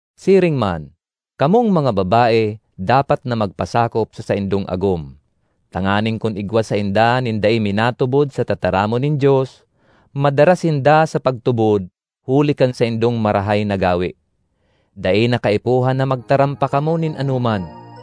Siring man, kamong mga babae dapat na magpasakop sa saindong agom, tanganing kun igwa sainda nin dai minatubod sa tataramon nin Dios, madara sinda sa pagtubod huli kan saindong marahay na gawe. Dai na kaipuhan na magtaram pa kamo nin anoman,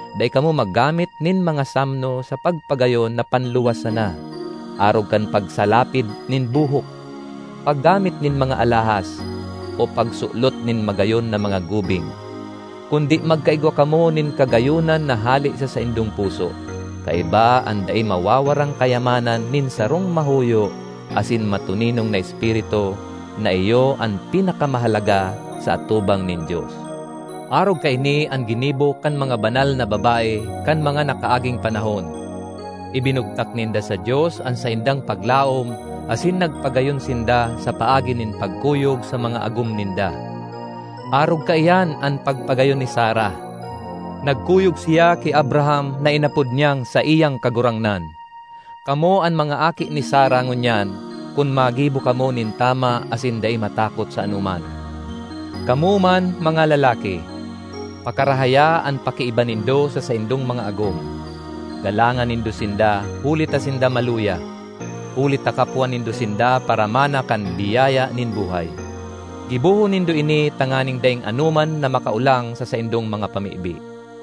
Dai kamo maggamit nin mga samno sa pagpagayon na panluwas sana, arog kan pagsalapid nin buhok, paggamit nin mga alahas, o pagsulot nin magayon na mga gubing. Kundi magkaigwa kamo nin kagayonan na hale sa saindong puso, kaiba an dai mawawarang kayamanan nin sarong mahuyo asin matoninong na espiritu, na iyo an pinakamahalaga sa atubang nin Dios. Arog kaini an ginibo kan mga banal na babae kan mga nakaaging panahon. Ibinugtak ninda sa Dios an saindang paglaom asin nagpagayon sinda sa paagi nin pagkuyog sa mga agom ninda. Arog kaiyan an pagpagayon ni Sara; nagkuyog siya ki Abraham na inapod niyang saiyang kagurangnan. Kamo an mga aki ni Sara ngunyan kun maggibo kamo nin tama asin dai matakot sa anoman. Kamo man, mga lalaki, pakarahaya an pakiiba nindo sa saindong mga agom. Galangan nindo sinda huli ta sinda maluya; huli ta kapwa nindo sinda paramana kan biyaya nin buhay. Gibohon nindo ini tanganing daing anoman na makaolang sa saindong mga pamibi.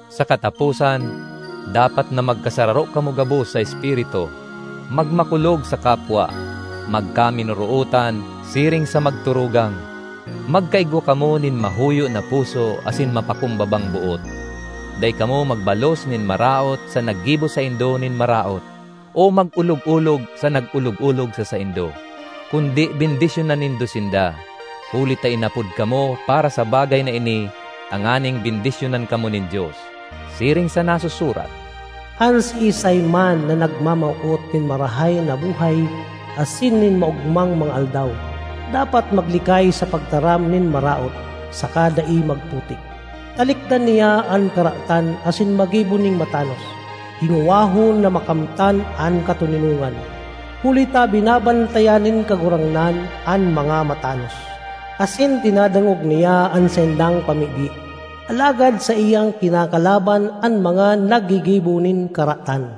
Sa kataposan, dapat na magkasararo kamo gabos sa espiritu, magmakulog sa kapwa, magkaminorootan siring sa magturugang; magkaigwa kamo nin mahuyo na puso asin mapakumbabang boot. Dai kamo magbalos nin maraot sa naggibo saindo nin maraot, o mag-olog-olog sa nag-olog-olog sa saindo; kundi bendisyonan nindo sinda, huli ta inapod kamo para sa bagay na ini tanganing bendisyonan kamo nin Dios. Siring sa nasusurat, “An siisay man na nagmamawot nin marahay na buhay asin nin maogmang mga aldaw, dapat maglikay sa pagtaram nin maraot, saka dai magputik. Talikdan niya an karatan asin maggibo nin matanos; hingowahon na makamtan an katoninongan. Huli ta binabantayan nin Kagurangnan an mga matanos, asin dinadangog niya an saindang pamibi; alagad saiyang kinakalaban an mga naggigibo nin karatan.”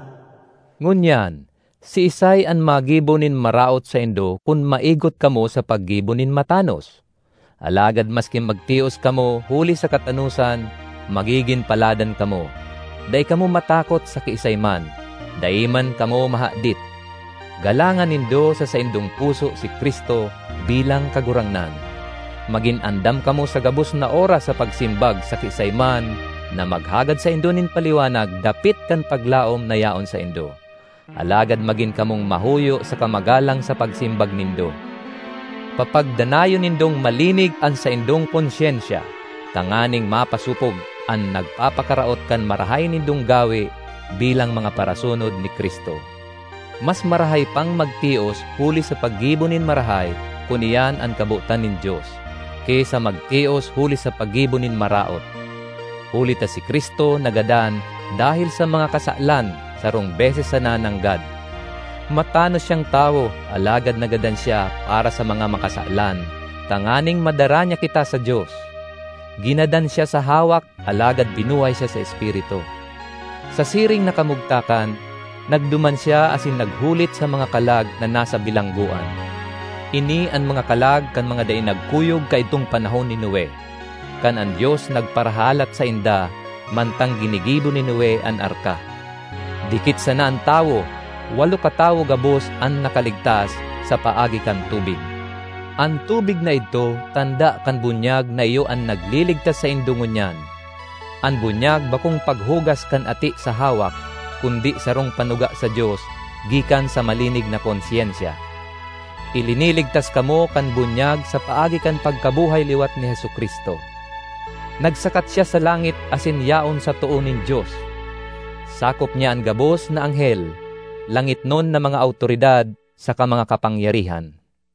Ngunyan, siisay an magibo nin maraot saindo kun maigot kamo sa paggibo nin matanos? Alagad maski magtios kamo huli sa katanosan, magigin paladan kamo. Dai kamo matakot sa kiisay man; dai man kamo mahadit. Galangan nindo sa saindong puso si Cristo bilang Kagurangnan. Magin andam kamo sa gabos na oras sa pagsimbag sa kiisay man na maghagad saindo nin paliwanag dapit kan paglaom na yaon saindo. Alagad magin kamong mahuyo saka magalang sa pagsimbag nindo. Papagdanayon nindong malinig an saindong konsyensya, tanganing mapasopog an nagpapakaraot kan marahay nindong gawe bilang mga parasunod ni Cristo. Mas marahay pang magtios huli sa paggibo nin marahay kun iyan an kabotan nin Dios, ki sa magtios huli sa paggibo nin maraot. Huli ta si Cristo nagadan dahel sa mga kasalan sarong beses sana nanggad. Matanos siyang tawo alagad nagadan siya para sa mga makasalan, tanganing madara niya kita sa Dios. Ginadan siya sa hawak alagad binuhay siya sa espiritu. Sa siring na kamugtakan, nagduman siya asin naghulit sa mga kalag na nasa bilanggoan. Ini an mga kalag kan mga dai nagkuyog kaidtong panahon ni Noe, kan an Dios nagparahalat sainda mantang ginigibo ni Noe an arka. Dikit sana an tawo—walo katawo gabos an nakaligtas sa paagi kan tubig. An tubig na idto tanda kan bunyag na iyo an nagliligtas saindo ngunyan. An bunyag bakong paghugas kan ati sa hawak kundi sarong panuga sa Dios gikan sa malinig na konsyensya. Iliniligtas kamo kan bunyag sa paagi kan pagkabuhay liwat ni Jesu-Cristo. Nagsakat siya sa langit asin yaon sa too nin Dios; sakop niya an gabos na anghel, langitnon na mga awtoridad saka mga kapangyarihan.